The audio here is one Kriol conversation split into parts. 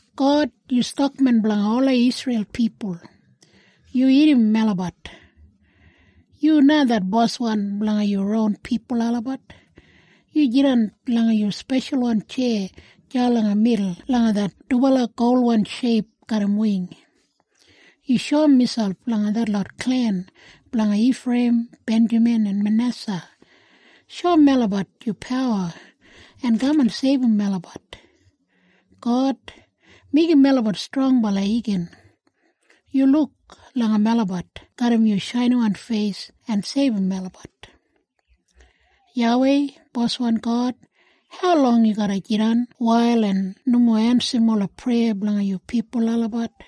God, yu stakmen blanga ola Isreil pipul. Yu irrim melabat. Yu na det boswan blanga yu ron pipul olabat. Yu jidan langa yu speshalwan tjeya deya langa midul langa det dubala golwan sheip garram wing. Yu shoum miselp langa detlot klen blanga Ifreiyim, Benjamin, en Manesa. Shoum melabat yu pawa en kaman seibum melabat. God, meigim melabat strongbala igin! Yu luk langa melabat garram yu shainiwan feis en seibum melabat. YAWEI, Boswan God, haulong yu garra jidan wail en nomo ensim ola preya blanga yu pipul olabat?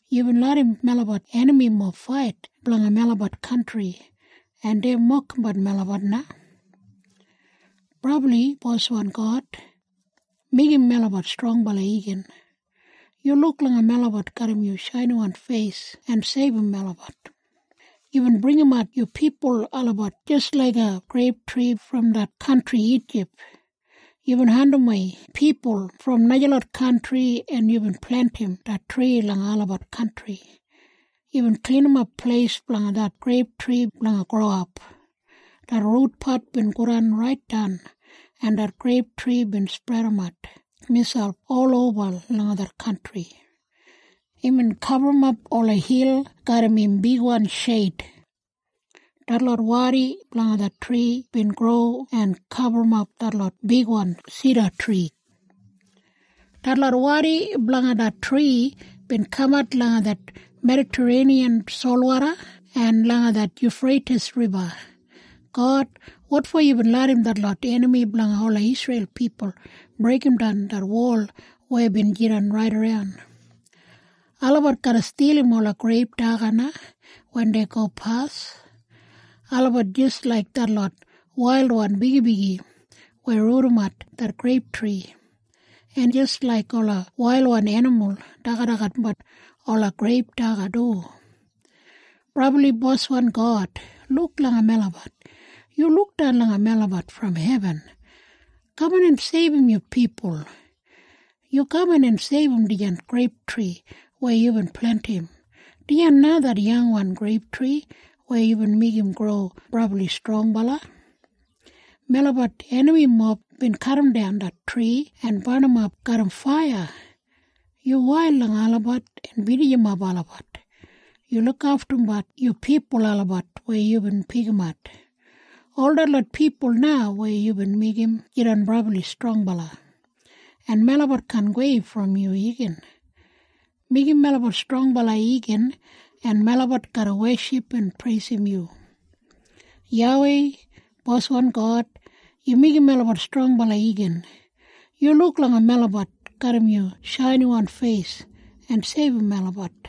Yubin larram melabat enamimob fait blanga melabat kantri, En dei mokimbat melabat na. Brabli Boswan God, meigim melabat strongbala igin! Yu luk langa melabat garram yu shainiwan feis en seibum melabat. Yubin bringimat yu pipul olabat jis laiga greiptri brom det kantri Ijip. Yubin andimwei pipul brom najalot kantri en yubin plentim det tri langa olabat kantri. Yubin klinimap pleis blanga det greiptri blanga growap. Det rutpat bin godan raitdan en det greiptri bin spredimat miselp oloba langa det kantri. Imbin gaburrumap ola hil garram im bigwan sheid. Detlot wadi blanga det tri bin gro en gaburrumap detlot bigwan sidatri. Detlot wadi blanga det tri bin kamat langa det Medatareiniyan solwoda en langa det Yufreitis Riba. God, wotfo yubin larram detlot enami blanga ola Isreil pipul breigimdan det wol weya bin jidan raidaran? Olabat garra stilim ola greip daga na wen dei gopas. Olabat jis laik detlot wailwan bigibigi weya rudimat det greiptri, en jis laik ola wailwan enimul dagadagatbat ola greip daga du. Brabli Boswan God, luk langa melabat! Yu lukdan langa melabat brom hebin. Kaman en seibum yu pipul. Yu kaman en seibum dijan greiptri weya yubin plentim, dijan na det yangwan greiptri weya yubin meigim gro brabli strongbala. Melabat enamimob bin kadimdan det tri en barnimap garram faiya. Yu wail langa olabat en binijimap olabat. Yu lukaftum yu pipul olabat weya yubin pikimat, ol detlot pipul na weya yubin meigim jidan brabli strongbala. En melabat kaan gowei brom yu igin. Meigim melabat strongbala igin en melabat garra weship en preisim yu. YAWEI, boswan God, yu meigim melabat strongbala igin. Yu luk langa melabat garram yu shainiwan feis en seibum melabat.